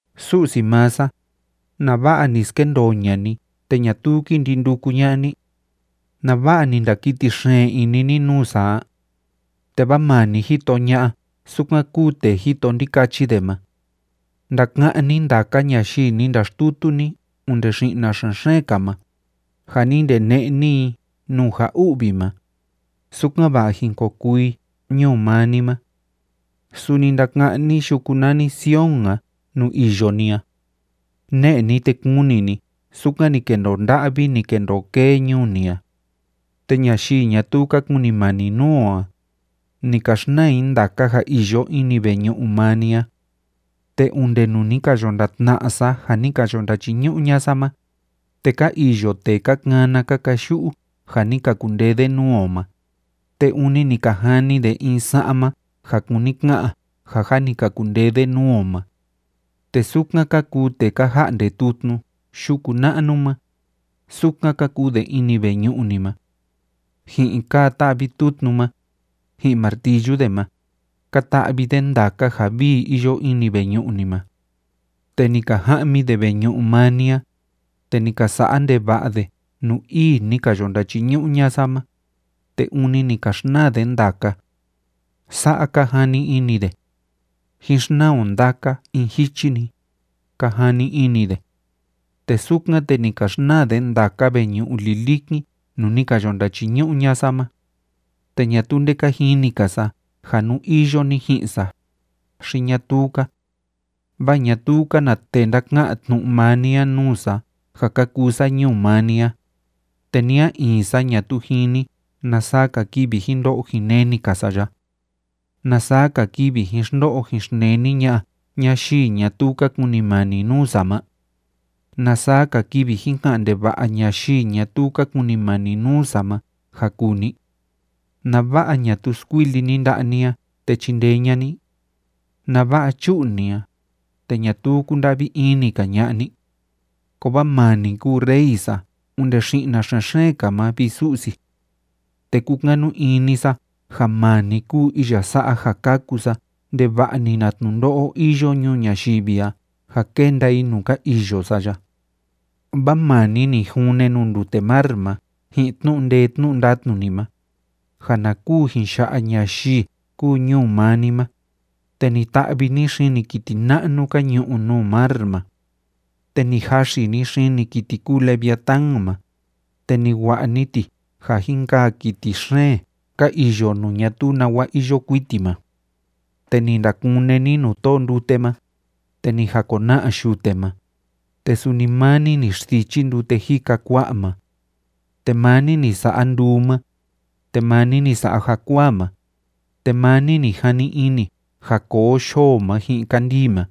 Su'si maa sa, ¿Nava'a ni skendoo ña'a ni te ñatuu kí ndi nduku ña'a ni? ¿Nava'a ni ndakiti xeen ini ni nuu sa a? Te vaa maa ni jito ña'a sukan kúu tee jito ndikachi de ma. Ndaka'án ni ndaka ñayii ni ndaxtutu ni onde xi'na xen‑xeen‑ka ma, ja ni ndene'e ni i nuu ja u'vi ma, sukan‑va'a jin ko kuu i ñuu maa ni ma. Suni ndaka'án ni yuku nani Sion a nuu iyo ni a. Ne'e ni, te kuni ni sukan ni kendoo nda'vi, ni kendoo kee ñuu ni a. Te ñayii ñatuu ka kunimani nuu o a, ni ka xnaa i ndaka ja iyo ini veñu'u maa ni a. Te onde nuu ni ka yo ndatna'a sa ja ni ka yo ndachiñu'u ña'a sa ma, te ka iyo tee ka kana ka kayu'u ja ni ka kundee de nuu o ma, te ûni ni ka jani de in sa'ma ja kúni ka'an ja jâ ni ka kundee de nuu o ma. Te sukan ka kuu tee ka ja'nde tutnu yuku na'nu ma, sukan ka kuu de ini veñu'u ni ma. Ji'in kaa tá'vi tutnu ma, ji'in martillu de ma, ka ta'vi de ndaka ja vii iyo ini veñu'u ni ma. Te ni ka ja'mi de veñu'u maa ni a, te ni ka sa'a ndeva'a de nuu ii ni ka yo ndachiñu'u ña'a sa ma, te ûni ni ka xnaa de ndaka. Sa'a ka jani ini de: “Jín xnaa o ndaka in jichi‑ni”, ka jani ini de. Te sukan, te ni ka xnaa de ndaka veñu'u lilikin nuu ni ka yo ndachiñu'u ña'a sa ma. Te ñatuu nde ka jini‑ka sa ja nú iyo ni ji'in sa, xi ñatuu‑ka, vaa ñatuu‑ka na tee ndaka'an tnu'u maa ni a nuu sa ja ka kuu sa ñuu maa ni a, te ni a in sa ñatuu jini na saa‑ka kivi jin ndo'o jin neni‑ka sa ya. ¿Na saa‑ka kivi jin xndo'o jin xneni ña'a ñayii ñatuu ka kunimani nuu sa ma? ¿Na saa‑ka kivi jin ka'an ndeva'a ñayii ñatuu ka kunimani nuu sa ma ja kuu ni? ¿Nava'a ñatuu skuili ni nda'a ni a te chindee ña'a ni? ¿Nava'a chu'u ni a, te ñatuu kunda'vi ini‑ka ña'a ni? Kovaa maa ni kúu Rey sa onde xi'na xen‑xeen‑ka ma, vi Su'si. Te kúkanu ini sa ja maa ni kúu iya sa'a ja kaku sa ndeva'a‑ni na tnundo'o iyo ñuu ñayivi a ja kenda i nuu ka iyo sa ya. Vaa maa ni ni june nuu ndute mar ma ji'in tnu'u ndee tnu'u ndatnu ni ma, ja na kuu jin ya'a ñayii kúu ñuu maa ni ma, te ni ta'vi ni xini kiti na'nu ka ñu'u nuu mar ma. Te ni jaxi ni xini kiti kúu leviatán ma, te ni wa'a ni ti ja jin kaa kiti xeen ka iyo nuu ñatuu nawa iyo kuiti ma. Te ni ndakune ni nuu tóo ndute ma, te ni jakona'a yute ma, te suni maa ni ni xsichi ndute jika kua'a ma. Te maa ni ni sa'a nduu ma, te maa ni ni sa'a jakuaa ma, te maa ni ni jani ini ja koo yoo ma ji'in kandii ma,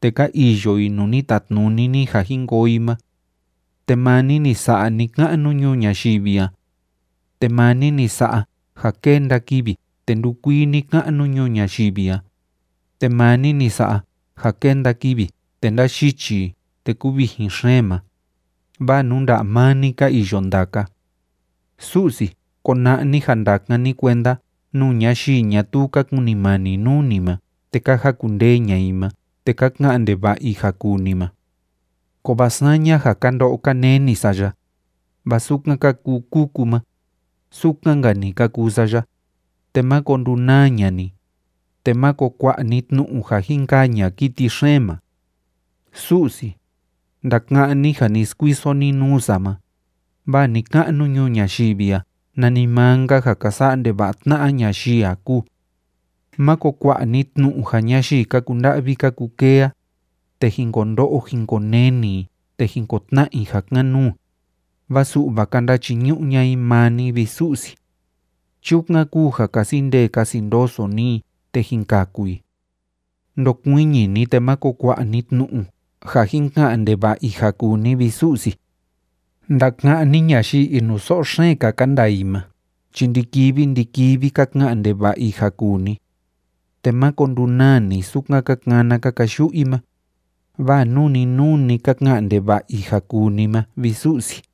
te ka iyo i nuu ni tatnuni ni ja jin koo i ma. Te maa ni ni sa'a ni‑ka'nu ñuu ñayivi a. Te maa ni ni sa'a ja kénda kivi te ndúkuii ni‑ka'nu ñuu ñayivi a, te maa ni sa'a ja kénda kivi te ndáyichi i te kúvijin xeen ma, vaa nuu nda'a maa ni ka iyo ndaka. Su'si, kona'a ni ja ndakan ni kuenda nuu ñayii ñatuu ka kunimani nuu ni ma te ka jakundee ña'a i ma te ka ka'an ndeva'a i ja kuu ni ma. Kovaa saña, ja ka ndo'o ka neni sa ya, vaa sukan ka kuu kuku ma, sukan‑nka‑ni ka kuu sa ya, te máko ndunaa ña'a ni, te máko kua'a ni tnu'u ja jin kaa ña'a kiti xeen ma. Su'si, ndaka'án ni ja ni skuiso ni nuu sa ma, vaa ni‑ka'nu ñuu ñayivi a nanimaa‑nka ja ka sa'a ndeva'a tna'a ñayii a kúu. Máko kua'a ni tnu'u ja ñayii ka kunda'vi ka kukee a, te jin ko ndo'o jin ko neni i te jin ko tna'a i ja kan‑nuu, vaa su'va ka ndachiñu'u ña'a i maa ni, vi Su'si. Chukan kúu ja kasi ndee kasi ndoso ni i, te jín kaku i. Ndokuiñi ni, te máko kua'a ni tnu'u ja jin ka'an ndeva'a i ja kuu ni, vi Su'si. Ndaka'án ni ñayii inuso'o xeen‑ka ka ndaa i ma chi ndi‑kivi ndi‑kivi ka ka'an ndeva'a i ja kuu ni. Te máko ndunaa ni sukan ka kana ka kayu'u i ma, vaa nuu‑ni nuu‑ni ka ka'an ndeva'a i ja kuu ni ma, vi Su'si.